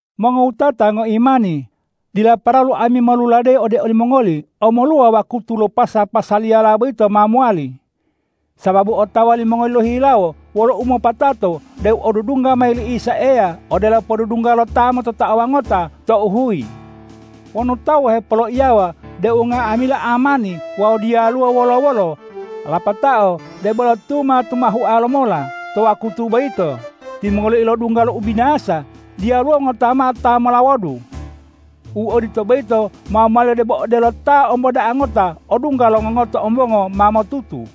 Mongowutata ngoimani, dila paralu ami moluladeyi ode olimongoli omoluwa wakutu lo pasa-pasaliyala boyito ma mowali. Sababu otawa limongoli lohihilawo wolo umopatato deu odudungga mayi li Isa Eya odelo podudungga lo ta mototaowa ngota tou huyi. Wonu tawu hepoloiyawa deu nga'amila amani wawu diyalu wolo-wolo, lapatao debolo tuma-tumahua lomola to wakutu boyito, timongoliyo ilodungga lo ubinasa; diyaluwo ngota mao ta melawodu. U odito boyito ma mowali debo odelo ta omboda'a ngota odungga lo ngongoto ombongo ma motutu.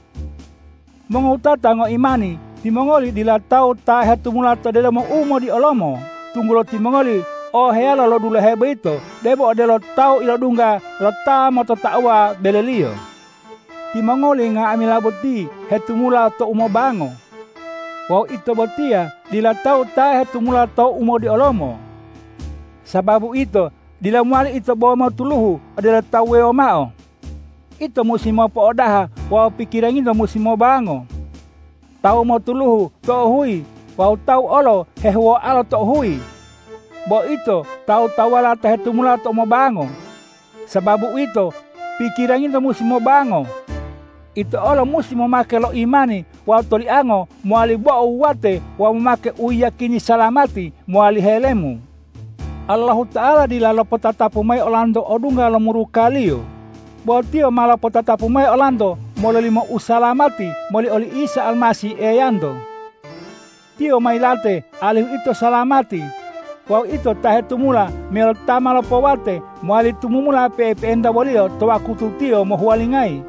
Mongowutata ngoimani, timongoli dila tawu ta hetumula to delomo umodiolomo, tunggulo timongoli oheyalo lo dulahe boyito, debo odelo tawu ilodungga lo ta mototaowa beleliyo. Timongoli nga'amila boti hetumula to umobango. Wawu ito botiya dila tawu ta hetumula to umodiolomo. Sababu uwito, dila mowali ito bo motuluhu odelo tawu wuwewo mao. Ito musi mopo'odaha wawu pikiranginto musi mobango. Tawu motuluhu tou huyi wawu tawu olo hehuwoalo tou huyi. Bo ito tawu-tawuwala ta hetumula to umobango. Sababu uwito, pikiranginto musi mobango. Ito olo musi momake lo imani wawu toliango mowali bo'o wuwate wawu momake u yiyakini salamati mowali helemu. Allahuta'ala dila lopotatapu mayi olanto odungga lo muruka-Liyo, bo Tiyo ma lopotatapu mayi olanto mololimo usalamati moli oli Isa Almasih Eyanto. Tiyo ma yilate alihu ito salamati. Wawu ito ta hetumula meyalo ta ma lopowate, mowali tumumula pe'epe'enta wo-Liyo to wakutu Tiyo mohuwalingayi.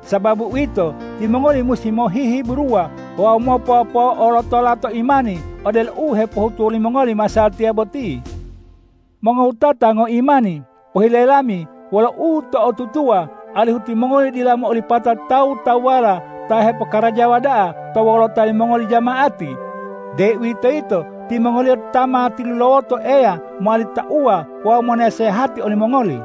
Sababu uwito, timongoli musi mohihiburuwa wawu mopopo'olotola to imani odelo u hepohutuwa limongoli masatiya boti. Mongowutata ngoimani, pohile lami wolo uto'otutuwa, alihu timongoli dila mo'olipata tawu-tawuwala ta hepokarajawa da'a to wolota limongoli jama'ati, deuwitoyito timongoliyo ta ma tilulawoto Eya mowali tauwa wawu monasehati olimongoli.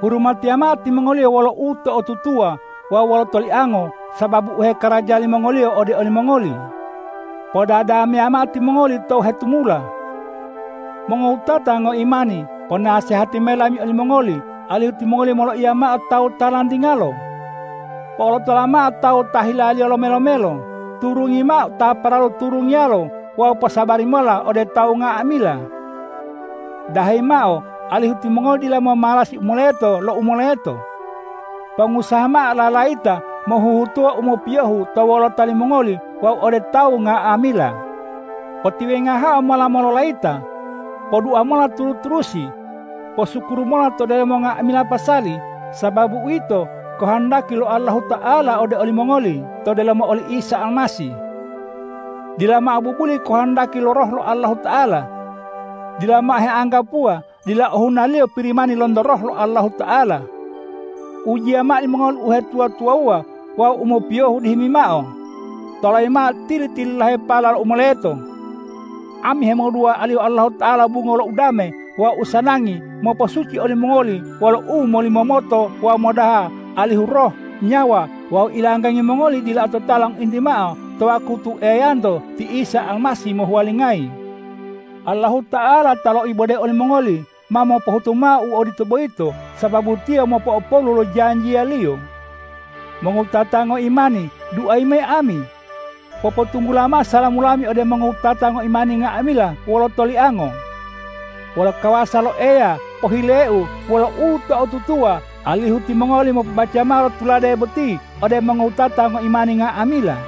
Hurumatiya mao timongoliyo wolo uto'otutuwa wawu wolo toliango sababu u hekaraja limongoliyo ode olimongoli. Podadameya mao timongoli tou hetumula. Mongowutata ngoimani, ponasehati mayi lami olimongoli, alihu timongoli moloiya mao tawu ta lantingalo. Po'olotola mao tawu ta hilaliyo lome-lomelo, turungi mao ta paralu turungiyalo wawu posabari mola ode tawu nga'amila. Dahayi mao alihu timongoli dila momalasi u moleto lo u moleto. Pongusaha mao lalayita mohuhutuwa u mopiyohu to wolota limongoli wawu ode tawu nga'amila. Potiwengahe mola mololayita. Podua mola turu-turusi. Posukuru mola to delomo nga'amila pasali, sababu uwito kohondaki lo Allahuta'ala ode olimongoli to delomo oli Isa Almasih. Dila mao bubuli kohondaki lo Roh lo Allahuta'ala. Dila mao heanggapuwa dila ohunaliyo Pirimani lonto Roh lo Allahuta'ala. Ujiya mao limongoli uhetuwa-tuwawuwa wawu u mopiyohu dihimi mao. Tolayi mao tili-tililahepala lo u moleto. Ami hemodua alihu Allahuta'ala bungo lo udame wawu usanangi mopo'osuci olimongoli wolo umolimomoto wawu modaha alihu roh, nyawa wawu ilanggangi mongoli dila ototala ngointi mao to wakutu Eyanto ti Isa Almasih mohuwalingayi. Allahuta'ala ta loibode olimongoli, ma mopohutu mao u odito boyito, sababu Tiyo mopo'opolu lo janjiya-Liyo. Mongowutata ngoimani, duayi mayi ami. Popotunggula mao salamu lami ode mongowutata ngoimani nga'amila wolo toliango. Wolo kawasa lo Eya pohileu wolo uto'otutuwa, alihu timongoli mopobaca mao lo tulade boti ode mongowutata ngoimani nga'amila.